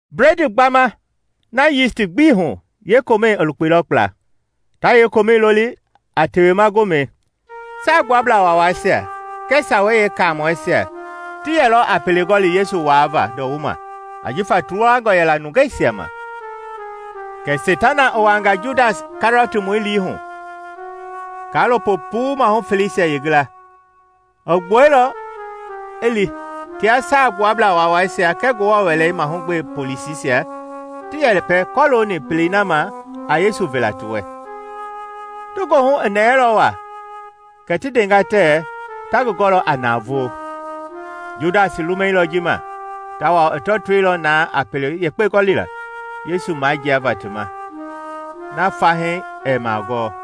Bledii gbamɛi na yisti gbii hu yeekomɛi i lukpeilɔ kpla. Ta yeekomɛi loli a Tewema Gomɛi. Saagbuablaa Waawaisia kɛɛ Sawei Yeekaamɔisia ti yɛlɔ a pele gɔli Yesu waavaa ndɔwuma ajifa ti luwangɔ yɛla nungeisia ma. Kɛ Seitana i wuanga Judas Kɛriɔtmɔi lii hu, kaalopo puu mahu feleisia yeengila. I gbuɛilɔ i li tia Saagbuablaa Waawaisia kɛɛ Ngewɔ Wɛlei mahugbe polisisia ti yɛpɛ kɔlooni pelei na ma a Yesu vela ti wɛ. Ti goohu i nɛɛlɔ wa kɛ ti ndenga tɛɛ ta ngi gɔlɔ a navoo. Judas i lumɛilɔ ji ma, tawao i tɔtoilɔ na a pele yekpe gɔlila Yesu majiava ti ma na fahii ɛɛ magɔɔ.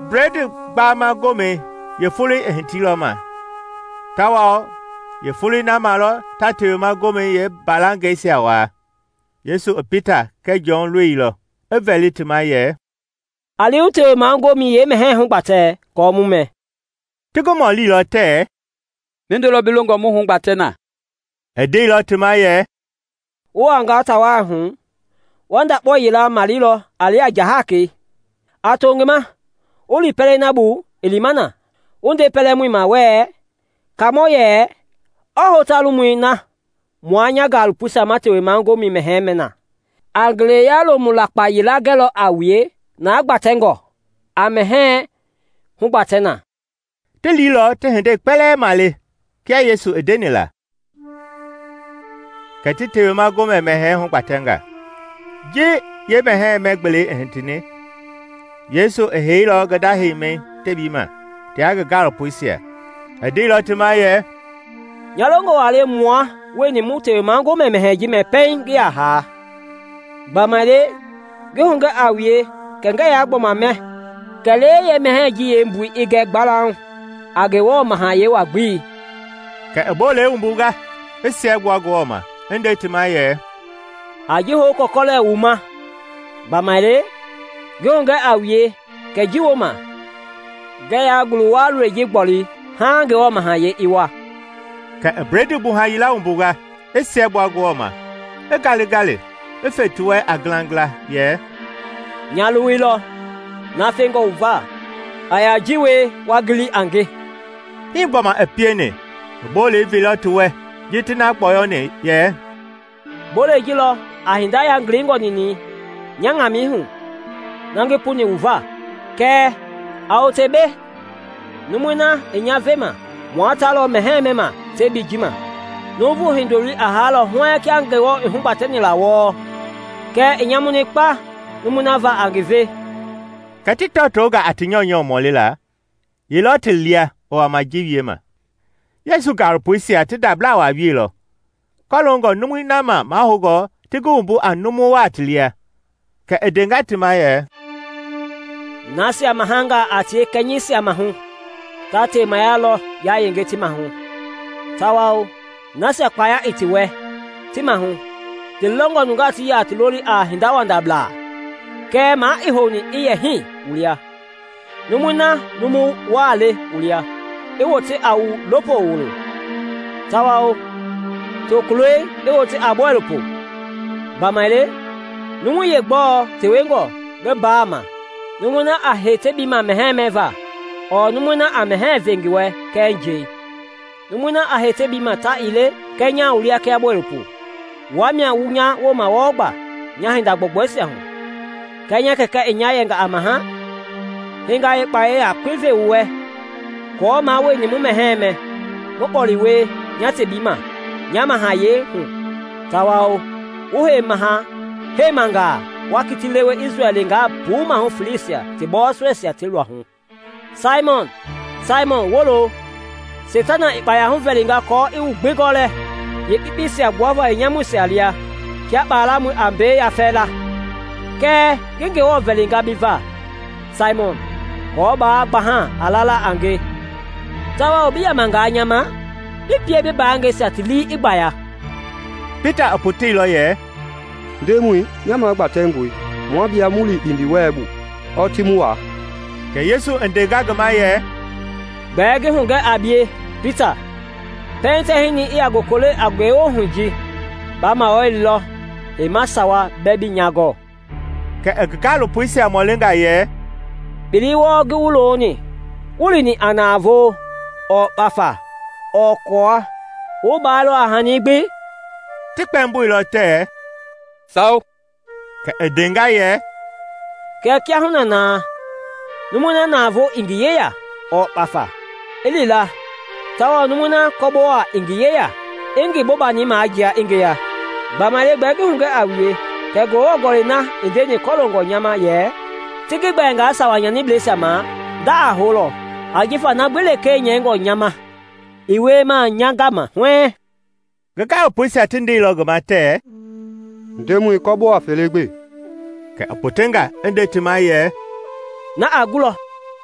Bledii Gbama Gomɛi yeefoloi i hitiilɔ ma tawao yeefoloi na ma lɔ ta Tewema Gomɛi yeembalangɛisia waa. Yesu i Pita kɛɛ Jɔn loilɔ, i vɛli ti ma yɛ, “A li wu Tewema Gomɛi yeemɛhɛɛ hugbatɛ aako mu mɛ.” Ti ngi mɔlilɔ tɛɛ, “Mindo lɔ bi longɔ mu hugbatɛ na?” I ndeilɔ ti ma yɛ, “Wu wuangaa ta wai hu, wa ndakpao yila maleilɔ a lia njahakɛi. A to ngi ma wu li pɛlei na bu i lima na, wu nde pɛlɛmɔi ma wɛɛ, ‘Kaamɔ yɛ, ɔɔ hota lomui na mua nya gaalopoisia ma Tewema Gomɛ mɛhɛɛ mɛ na?’ A ngeleya lomu lakpa yila gɛlɔ a wue na gbatɛngɔ; a mɛhɛɛ hugbatɛ na.” Ti liilɔ ti hindei kpɛlɛɛ male kia Yesu i ndeni la, kɛ ti Tewema Gomɛ mɛhɛɛ hugbatɛnga. Ji yeemɛhɛɛ mɛ-gbelei i hitini, Yesu i heilɔ ngi nda heimi tebii ma tia ngi gaalopoisia. I ndeilɔ ti ma yɛ, “Nya longɔ wa le mua wueni mu Tewema Gomɛ mɛhɛɛ ji mɛ pɛiŋ ngi ya haa; gbamaile, ngi hugɛ a wue kɛ ngɛɛ ya gbɔma mɛ kɛlee yeemɛhɛɛ ji yeembui i gɛ gbalauŋ a Ngewɔ Mahayɛi wa- gbelei.” Kɛ i bolei wumbunga, i siɛgbua Ngewɔ ma, i nde ti ma yɛ, “A ji hou wu kɔlɛkɔlɛ wu ma; gbamaile, ngi hugɛ a wue kɛ ji wooma, ngɛɛ ya ngulu-wua lɔi ji gboli haaŋ Ngewɔ Mahayɛi i wa.” Kɛ i bledii gbuha yila wumbunga, i siɛgbua Ngewɔ ma, i ngalingali, i fe ti wɛ a ngilangila yɛ, “Nya luwui lɔ, na fɛngɔ wu va. A ya a ji wie wa ngili a nge.” Hi gbɔma i pieni, i bolei veilɔ ti wɛ ji ti na gbɔyɔni, yɛ “Bolei ji lɔ a hindei yangilingɔ ninɛi nya ŋamɛihu, na ngi puni wu va.” “Kɛɛ, a wote mbei! Numui na i nya vema mua ta lɔ mɛhɛɛ mɛma tebii ji ma. Nuuvu Hindoloi a haalɔ huɛɛŋ kia Ngewɔ i hugbatɛni la wɔɔ kɛɛ i nyamuni kpa numui na va a ngi ve!” Kɛ ti tɔtonga a ti nyɔunyɔu mɔlila ye lɔ ti lia i wama ji wiema. Yesu gaalopoisia ti ndabla wa wieilɔ kɔloongɔ numui na ma mahoungɔ ti ngi wumbu a numu wa ti lia. Kɛ i ndenga ti ma yɛ, “Nasia mahangaa a tie kɛnyɛisia mahu ta temaya lɔ yayenge ti mahu; tawao nasia kpaya i ti wɛ ti mahu ti longɔ nungaa ti yɛ a ti loli a hindawandabla, kɛɛ ma ii houni i yɛ hii wu lia; numui na numu wa le wu lia i wote a wu lopo wulo, tawao tokulɔi i wote a bɔilopo. Gbamaile, numui yeegbɔɔ tewengɔ ngi mbaa ma, numui na a hei tebii ma mɛhɛɛ mɛva ɔɔ numui na a mɛhɛɛ ve ngi wɛ kɛɛ njɛi? Numui na a hei tebii ma ta ii le? Kɛɛ nya wu lia kia bɔilopo. “Wua mia wu nya wooma wɔɔ gba nya hinda gbɔugbɔisia hu; kia nya Kɛkɛ i nya yɛnga a maha, hii nga yeekpaya yakpei ve wu wɛ, aako mua wueni mu mɛhɛɛ mɛ, mu kpɔle wie nya tebii ma nya mahayɛi hu tawao wu hei maha-heimangaa wa kiti lewe Isrɛl leenga puu mahu feleisia ti bɔɔsɔisia ti luahu. “Saimɔn, Saimɔn, wolo! Seitana i kpaya huvɛlinga aako i wu gbi gɔlɛ, yeekpekpeisia gbuava yeenyamuisia lia kia kpalamɔi a mbei mayafɛla, kɛɛ ngi Ngewɔ vɛlinga bi va, Saimɔn, kɔɔ baa gbaha a lala a nge; tawao bi yamangaa nya ma, bi pie bi mbaangɛisia ti lii i gbaya.” Pita i poteilɔ yɛ, “Ndemɔi, nya magbatɛngɔe mua bie mu li kpindiwɛlei bu ɔɔ ti mu waa.” Kɛ Yesu i ndenga ngi ma yɛ, “Gbɛɛ ngi hugɛ a bie, Pita, pɛiŋ tɛhinɛi i ya gokole a ngewohui ji, ba mawalilɔ heima sawa bɛɛ bii nya gɔɔ.” Kɛ i ngi gaalopoisia mɔlinga yɛ, “Kpelei wɔɔ ngi wu loni wuii lini a navoo ɔɔ kpafa ɔɔ kɔɔwa, wu baalɔ a hani gbi?” Ti kpɛmboilɔ tɛɛ, “Sawo.” Kɛ i ndenga yɛ, “Kɛɛ kiahuna na, numui na navoo i ngi yeya ɔɔ kpafa, i li la; tawao numui na kɔbowa ii ngi yeya, i ngi bobani majia i ngeya. Gbamaile gbɛɛ ngi hugɛ a wue kɛ Ngewɔ Gɔlɛi na i ndeni kɔloongɔ nya ma yɛ, ‘Ti ngi gbɛɛnga sawa nyanibleisia ma’ nda a houlɔ ajifa na gbi lekee nyɛingɔ nya ma, i wiema nya gama huɛɛŋ.” Ngi gaalopoisia ti ndeilɔ ngi ma tɛɛ, “Ndemɔi, kɔbowa fele gbe!” Kɛ i potenga i nde ti ma yɛ, “Na a gulɔ!”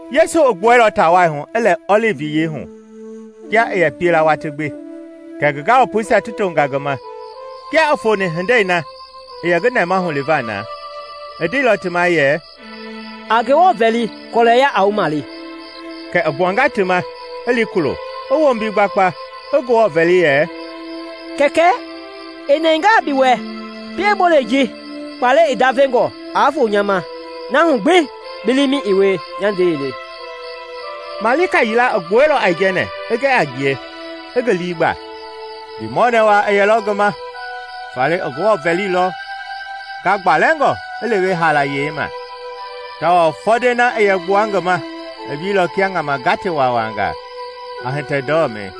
Yesu i gbuɛilɔ ta wai hu i lɛ Ɔlivi Yiyei hu kia i yɛ pie la watii gbi, kɛ ngi gaalopoisia ti tonga ngi ma. Kia i foni hindei na i yɛ ngi nɛmahu liva na, i ndeilɔ ti ma yɛ, “A Ngewɔ vɛli kɔlɛya aa wu male.” Kɛ i gbuanga ti ma, i li kulo, i wombi gbakpa, i Ngewɔ vɛli yɛ, “Kɛkɛ, i nɛngaa bi wɛ, pie bolei ji, kpalɛi i ndavengɔ, aa foo nya ma; na hu gbi bi liimɛi i wie, nya ndɛi ii le.” Malika yila i gbuɛilɔ aijɛnɛ i gɛ a ngie, i ngi lii gba. Ndiimɔɔnɛ wa i yɛlɔ ngi ma faale i Ngewɔ vɛlilɔ ngagbalɛngɔ i lewe haalayei ma; tawao fɔndɛi na i yɛ gbua ngi ma i wieilɔ kia ŋama gate wawangaa, a hitɛ ndɔmɛi.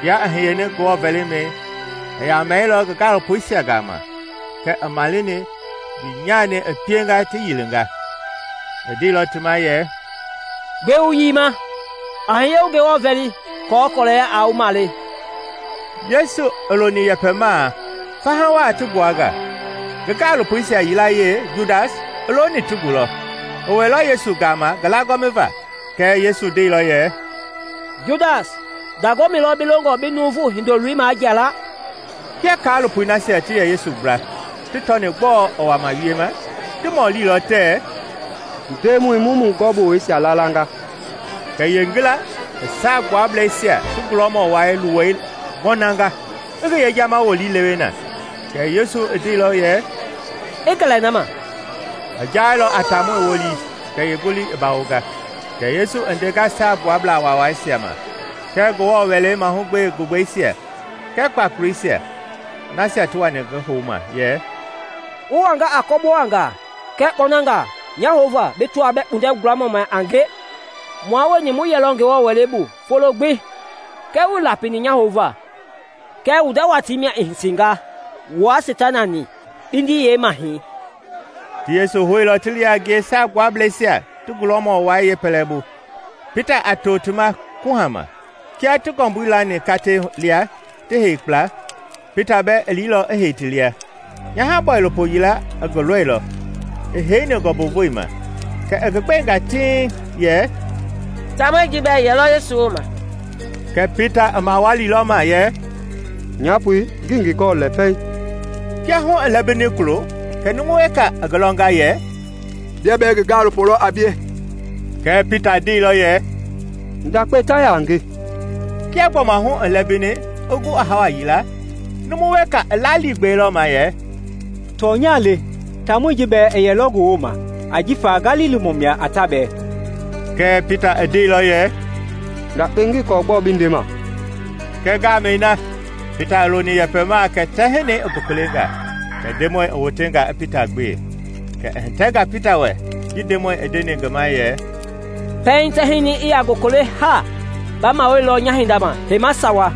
Kia i hiyeni Ngewɔ vɛlimɛi i yamɛilɔ ngi gaalopoisia gama kɛɛ i maleni ndiinyani i pienga ti yiinga. I ndeilɔ ti ma yɛ, “Gbɛe wu yiima? A hiye wu Ngewɔ vɛli aako kɔlɛya aa wu male.” Yesu i loni yɛpɛmaa, faha waa ti gbua nga, ngi gaalopoisia yilayee, Judas, i looni ti gulɔ. I wɛilɔ Yesu gama ngi lagɔmiva. Kɛɛ Yesu ndeilɔ yɛ, “Judas, ndagɔmi lɔ bi longɔ bi Nuuvu Hindoloi majia la?” Kia kaalopoi nasia ti yɛ Yesu gbla ti tɔni gbɔɔ i wama wiema, ti mɔlilɔ tɛɛ, “Ndemɔi, mu mu gɔbowɛisia laala nga?” Kɛ yeengila i Saagbuablɛisia ti gulɔmɔ wai luwei ŋɔnanga i ngi yejama wolii lewe na. Kɛɛ Yesu i ndeilɔ yɛ, “I gɛlɛ na ma!” I jailɔ a taamɔi wolii kɛ yeengolii i bawonga. Kɛ Yesu i ndenga Saagbuablaa Waawaisia ma kɛɛ Ngewɔ Wɛlei mahugbe gugbɛisia kɛɛ kpakoleisia, nasia ti wani ngi houma yɛ, “Wu wanga a kɔbowangaa kɛɛ kpɔnangaa nya houva bi tɔaa bɛɛ kpundɛ gulamɔ mia a nge? Mua wueni mu yɛlɔ Ngewɔ Wɛlei bu folo gbi kɛɛ wuii lapini nya houva. Kɛɛ wu nda watii mia i hitinga wua Seitana-ni, kpindi yeemahɛi.” Ti Yesu houilɔ ti li a ngie Saagbuablɛisia ti gulɔmɔ wai yeepɛlɛbu, Pita a to ti ma kuhama. Kia ti ngɔmbui lani katei lia ti hei kpla, Pita bɛɛ i liilɔ i hei ti lia. Nyaha-bɔilopo yila i ngi lɔilɔ i heini ngɔmbuvoi ma; kɛ i ngi gbenga tiŋ yɛ, “Taamɔi ji bɛɛ i yɛlɔ Yesu wooma!” Kɛɛ Pita i mawalilɔ ma yɛ, “Nyapoi, ngii ngi gɔɔ lɛ pɛiŋ.” Kia hu i lɛmbini kulo kɛ numu weka i ngi lɔnga yɛ, “Bia bɛɛ ngi gaalopoi lɔ a bie.” Kɛɛ Pita ndeilɔ yɛ, “Ndakpei, ta ya a nge.” Kia gbɔma hu i lɛmbini i gu a hawa yila, numu weka i laliigbɛilɔ ma yɛ, “Tɔnya le, taamɔi ji bɛɛ i yɛlɔ ngi wooma ajifa Galilimɔ mia a ta bɛɛ.” Kɛɛ Pita i ndeilɔ yɛ, “Ndakpei, ngii kɔɔ gbɔɔ bi ndema.” Kɛɛ ngamɛi na, Pita i loni yɛpɛmaa kɛ tɛhinɛi i gokolenga. Kɛ Ndemɔi i wotenga i Pita gbe. Kɛ i hitɛnga Pita wɛ ji Ndemɔi i ndeni ngi ma yɛ, “Pɛiŋ tɛhinɛi i ya gokole haa, ba mawalilɔ nya hindama heima sawa.”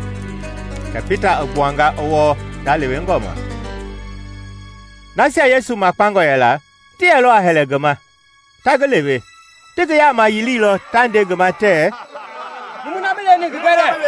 Kɛ Pita i gbuanga i wɔɔ ndalewengɔ ma. Nasia Yesu makpangɔ yɛla ti yɛlɔ a hɛlɛ ngi ma, ta ngi lewe. Ti ngi yaama yiliilɔ ta nde ngi ma tɛɛ, “Numui na i bi leweni ngi gɛ lɛɛ!”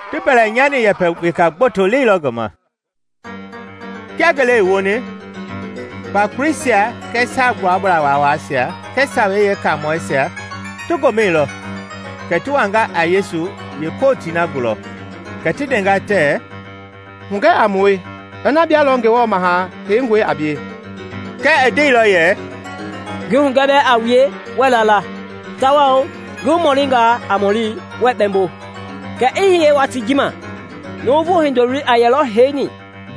Ti mbɛlɛnyani yɛpɛ weka gboto leilɔ ngi ma. Kia ngele i woni, kpakoleisia kɛɛ Saagbuablaa Waawaisia kɛɛ Sawei Yeekaamɔisia ti gomɛilɔ kɛ ti wanga a Yesu yeekootii na gulɔ. Kɛ ti ndenga tɛɛ, “Hugɛ a mue ina bia lɔ Ngewɔ Maha Heingɔi a bie.” Kɛɛ i ndeilɔ yɛ, “Ngi hugɛ bɛɛ a wue, wɛɛ la la; tawao ngi wu mɔlinga a mɔli, wɛɛ kpɛmbo. Kɛɛ i hiye watii ji ma, Nuuvu Hindoloi a yɛlɔ heini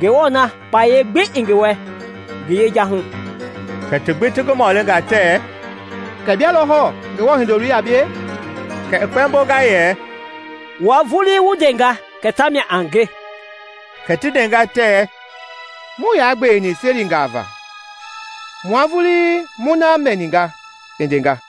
Ngewɔ na kpayei gbi i ngi wɛ ngi yeja hu.” Kɛ ti gbi ti ngi mɔlinga tɛɛ, “Kɛ bia lɔ hɔɔ Ngewɔ Hindoloi a bie?” Kɛ i kpɛmbonga yɛ, “Wua vulii wu ndenga kɛ tamia a nge.” Kɛ ti ndenga tɛɛ, “Muii ya gbeweni selingaa va! Mua vulii mu na mɛninga i ndenga!”